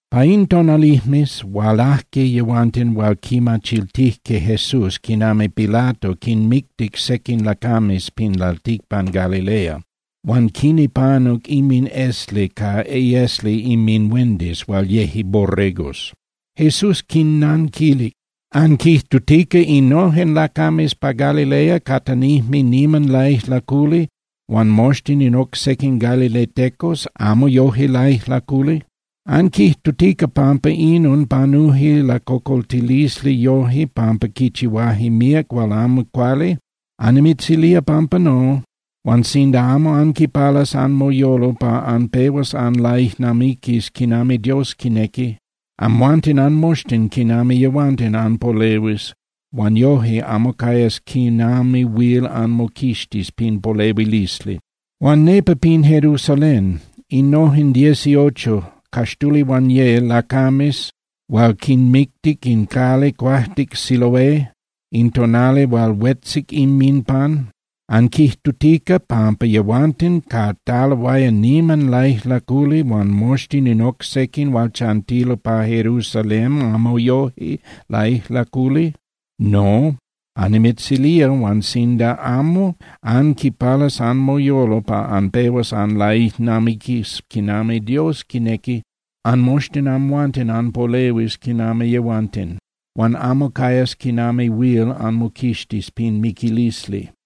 Pa in tonalijmes hualajque yehuanten hual quimachiltijque Jesús quinami Pilato quinmictic sequin lacames pin lalticpan Galilea huan quinipanuc inminesli ca iesli inminhuendis hual yeje borregos. Jesús quinnanquilic: —¿Anquijtutica innojen lacames pa Galilea catanijme niman laijlaculi huan moxtin in oc sequin galiletecos amo yoje laijlaculi? ¿Anquijtutica pampa inon panuje lacocoltilisli yoje pampa quichihuaje míac hual amo cuali? Annimitzilía pampa no. Huan sinda amo anquipalas anmoyolo pa anpehuas anlaijnamiquis quinami Dios quinequi, amhuanten anmoxtin quinami yehuanten anpolehuis huan yoje amo cayas quinami huil anmoquixtis pin polehuilisli. Huan nepa pin Jerusalén, innojen dieciocho (caxtulihuanye) lacames hual quinmictic in cali cuajtic Siloé in tonali hual huetzic inminpan, ¿anquijtutica pampa yehuanten cataloaya niman laijlaculi huan moxtin in oc sequin hual chantilo pa Jerusalén amo yoje laijlaculi? No, annimitzilía, huan sinda amo anquipalas anmoyolo pa anpehuas anlaijnamiquis quinami Dios quinequi, anmoxtin amhuanten anpolehuis quinami yehuanten, huan amo cayas quinami huil anmoquixtis pin miquilisli.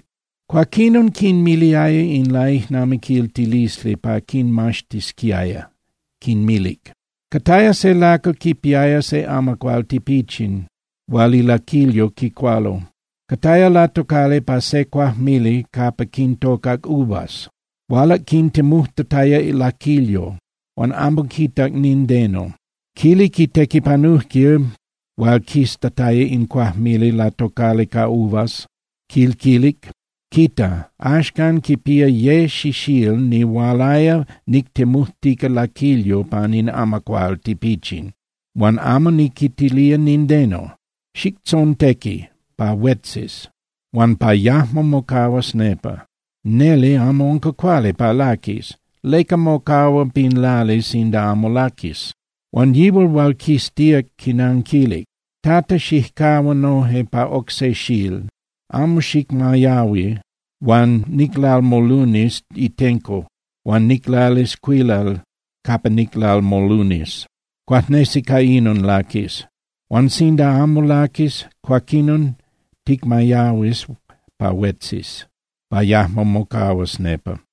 Cuaquinon quinmiliaya in laijnamiquiltilisli pa quinmaxtisquiaya, quinmilic: —Cataya se lacal quipiaya se amacuál tipichin hual ilaquilyo quicualo. Cataya latocali pa se cuajmili capa quintocac uvas. Hualac quintemujtataya laquilyo, huan amo quitac nindeno. Quilic itequipanujquil hual quiztataya in cuajmili latocali ca uvas, quil quilic: “Quita. Axcan quipía ye xixíl nihualaya nictemujtica laquilyo pan in amacuál tipichin huan amo niquitilía nindeno. Xictzontequi pa huetzis huan pa yajmo mocahuas nepa, neli amo unca cuali pa laquis. ¿Leca mocahua pin lali sinda amo laquis?” Huan yihual hual quiztíac quinanquilic: “Tata, xijcahua noje pa oc se xíl, amo xicmayahui huan niclalmolunis itenco huan niclalis cuilal capa niclalmolunis. Cuajnesi ca inon laquis. Huan sinda amo laquis, cuaquinon ticmayahuis pa huetzis, pa yajmo mocahuas nepa.”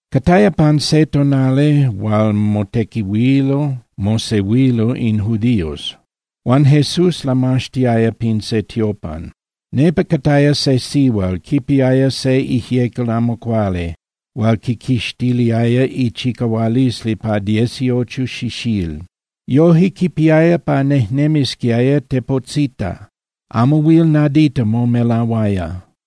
Cataya pan se tonali hual motequihuilo mosehuilo in judíos, huan Jesús lamaxtiaya pin se tiopan. Nepa cataya se sihual, quipiaya se ijyecal amo cuali hual quiquixtiliaya ichicahualisli pa dieciocho xixíl. Yoje quipiaya pa nejnemisquiaya tepotzita, amo huil nadita momelahuaya.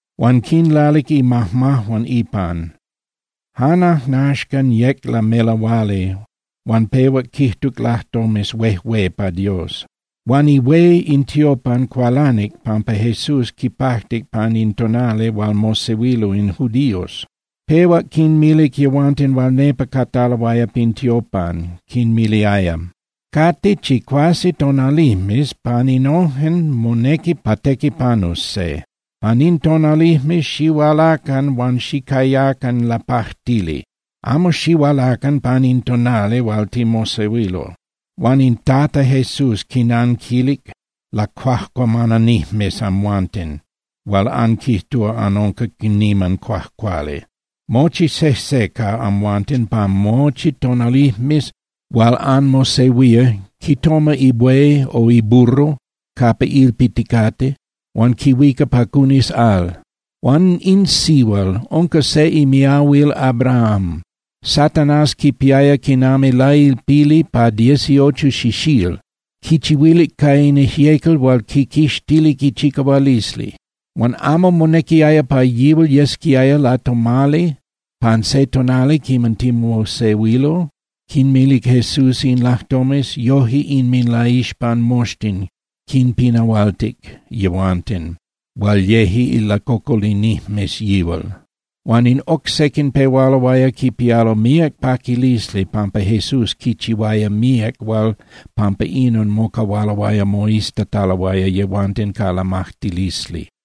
Huan quinlalic imajmajuan ipan. Jan ajnaxcan yec lamelahuali, huan pehuac quijtuc lajtomes huejué pa Dios. Huan ihué in tiopan cualanic pampa Jesús quipajtic pan in tonali hual mosehuilo in judíos. Pehuac quinmilic yehuanten hual nepa cataloaya pin tiopan, quinmiliaya: —Cate chicuase tonalijmes, pan innojen monequi pa tequipanus se. Pan in tonalijmes xihualacan huan xicayacan lapajtili, amo xihualacan pan in tonali hual timosehuilo. Huan in Tata Jesús quinanquilic: —Lacuajcuamananijmes amhuanten hual anquijtúa anunca niman cuajcuali. Mochi sejse ca amhuanten pan mochi tonalijmes hual anmosehuía quitoma ibuey o iburro capa ilpiticate huan quihuica pa cunis al. Huan in sihual unca se imiahuil Abraham. Satanás quipiaya quinami lailpili pa dieciocho xixíl. Quichihuilic ca in ijyecal hual quiquixtilic ichicahualisli. Huan ¿amo monequiaya pa yihual yesquiaya latomali pan se tonali quiman timosehuilo? Quinmilic Jesús in lajtomes, yoje inminlaixpan moxtin quinpinahualtic yehuanten hual yeje ilacocolinijmes yihual. Huan in oc sequin pehualoaya quipialo míac paquilisli pampa Jesús quichihuaya míac hual pampa inon mocahualoaya moiztataloaya yehuanten ca lamajtilisli.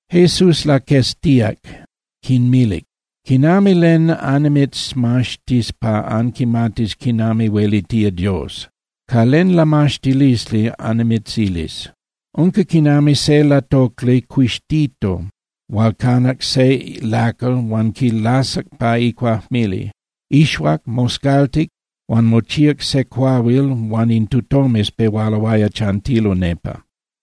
Jesús laqueztíac, quinmilic: —¿Quinami len annimitzmaxtis pa anquimatis quinami huelitía Dios? ¿Ca len lamaxtilisli annimitzilis? Unca quinami se latocli cuixtito hual canac se lacal huan quilasac pa icuajmili. Ixuac, moscaltic huan mochíac se cuahuil huan in tutomes pehualoaya chantilo nepa.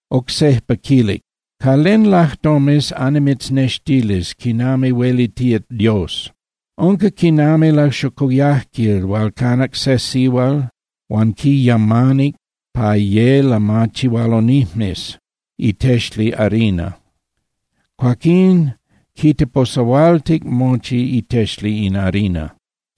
Oc sejpa quilic: —¿Ca len lajtomes annimitznextilis quinami huelitía Dios? Unca quinami laxocoyajquil hual canac se sihual huan quiyamanic pa ye lamachihualonijmes itexli harina, cuaquín quiteposahualtic mochi itexli in harina.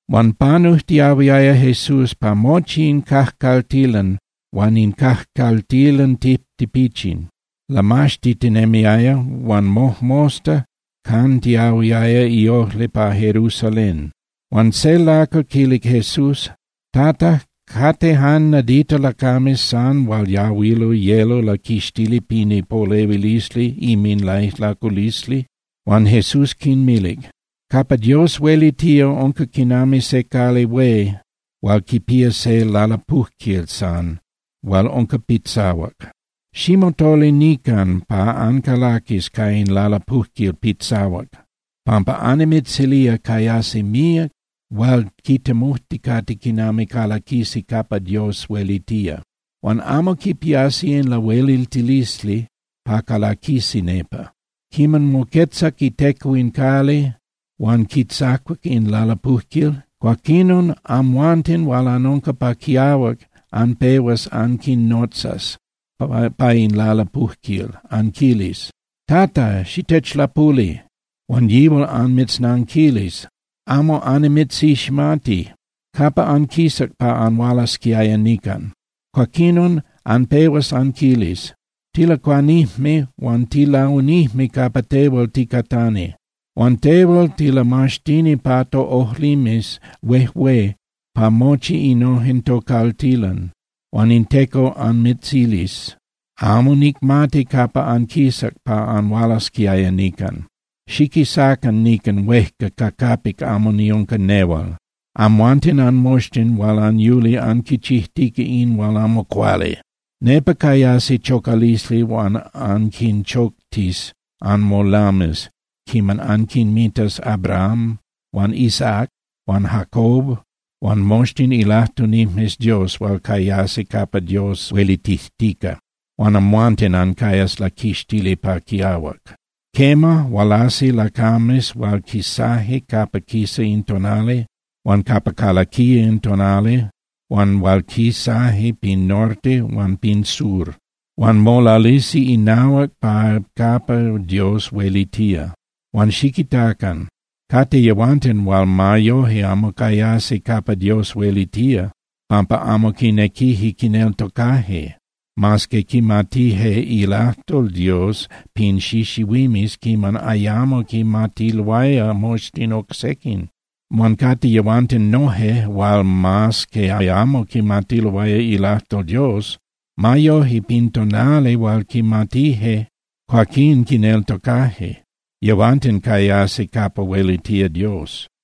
Huan panujtiahuiaya Jesús pa mochi in cajcaltilan huan in cajcaltilan tijtipichin. Lamaxtitinemiaya, huan mojmosta cantiyahuiaya iojli pa Jerusalén. Huan se lacal quilic Jesús: —Tata, ¿cate jan nadita lacames san hual yahuilo yelo laquixtili pin ipolehuilisli inminlaijlaculisli? Huan Jesús quinmilic: —Capa Dios huelitía unca quinami se cali hué hual quipía se lalapujquil san hual unca pitzahuac. Ximotolinican pa ancalaquis ca in lalapujquil pitzahuac, pampa annimitzilía cayasi míac hual quitemujticate quinami calaquisi capa Dios huelitía, huan amo quipiasi in lahueliltilisli pa calaquisi nepa. Quiman moquetzac iTeco in cali huan quitzacuac in lalapujquil, cuaquinon amhuanten hual anunca pa quiahuac anpehuas anquinotzas pa in lalapujquil, anquilis: “¡Tata, xitechlapuli!” Huan yihual anmitznanquilis: “Amo annimitziximati, ¿capa anquisac pa anhualasquiaya nican?” Cuaquinon anpehuas anquilis: “Tilacuanijme huan tilaunijme capa tehual ticatani. Huan tehual tilamaxtini pa toꞌojlimes huejué pa mochi innojen tocaltilan.” Huan in Teco anmitzilis: “Amo nicmati capa anquisac pa anhualasquiaya nican. Xiquisacan nican huejca ca capic amo niunca nehual, amhuanten anmoxtin hual anyuli anquichijtica in hual amo cuali.” Nepa cayasi chocalisli huan anquinchoctis anmolames quiman anquinmitas Abraham huan Isaac huan Jacob huan moxtin ilajtunijmes Dios hual cayasi capa Dios huelitijtica, huan amhuanten ancayas laquixtili pa quiahuac. Quema, hualasi lacames hual quisaje capa quisa in tonali huan capa calaquía in tonali huan hual quisaje pin norte huan pin sur. Huan molalisi inahuac pa capa Dios huelitía. Huan xiquitacan. Cate yehuanten hual ma yoje amo cayasi capa Dios huelitía, pampa amo quinequije quineltocaje, mas que quimatije ilajtol Dios pin xixihuimes quiman ayamo quimatiloaya moxtin oc sequin. Huan cate yehuanten noje hual mas que ayamo quimatiloaya ilajtol Dios, ma yoje, pin tonali hual quimatije, cuaquín quineltocaje. Yehuanten cayasi capa huelitía Dios.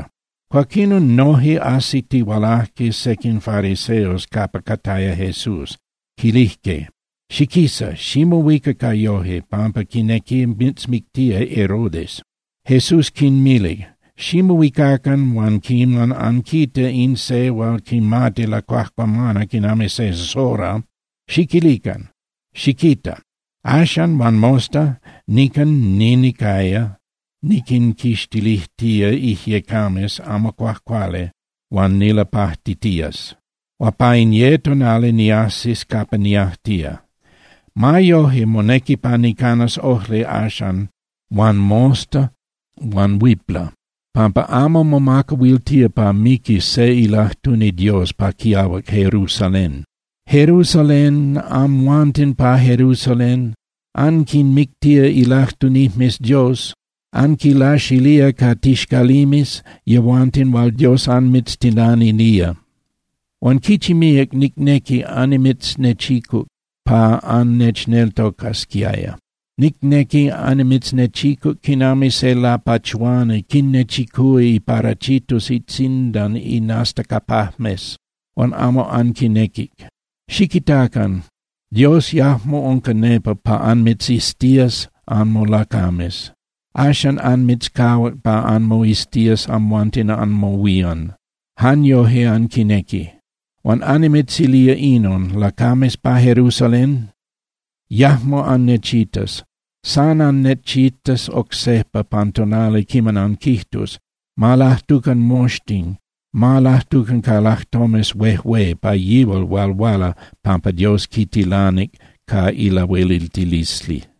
Cuaquinon noje ajsitihualajque sequin fariseos capa cataya Jesús, quilijque: —Xiquisa, ximohuica ca yoje, pampa quinequi mitzmictía Herodes. Jesús quinmilic: —Ximohuicacan huan quiman anquita in se hual quimati lacuajcuamana quinami se zorra, xiquilican: “Xiquita. Axan huan mosta nican ninicaya niquinquixtilijtía ijyecames amo cuajcuali huan nilapajtitías. Huan pa in ye tonali niajsis capa niajtía.” Ma yoje monequi pa nicanas ojli axan huan mosta huan huipla, pampa amo momacahuiltía pa miquis se ilajtuni Dios pa quiahuac Jerusalén. ¡Jerusalén, amhuanten pa Jerusalén, anquinmictía ilajtunijmes Dios, anquinlaxilía ca tixcalimes yehuanten hual Dios anmitztilanilía! Huan ¡quichi míac nicnequic annimitznechicuc pa annechneltocasquiaya! Nicnequic annimitznechicuc quinami se lapachuani quinnechicúa iparachitos itzindan inastacapajmes, huan amo anquinequic. Xiquitacan. Dios yajmo unca nepa pa anmitziztías anmolacames. Axan anmitzcahuac pa anmoiztías amhuanten anmohuían, jan yoje anquinequi. Huan annimitzilía inon, lacames pa Jerusalén: Yajmo annechitas. San annechitas oc sejpa pan tonali quiman anquijtus: “Ma lajtucan moxtin, ma lajtucan ca lajtomes huejué pa yihual hual huala pampa Dios quitilanic ca ilahueliltilisli.”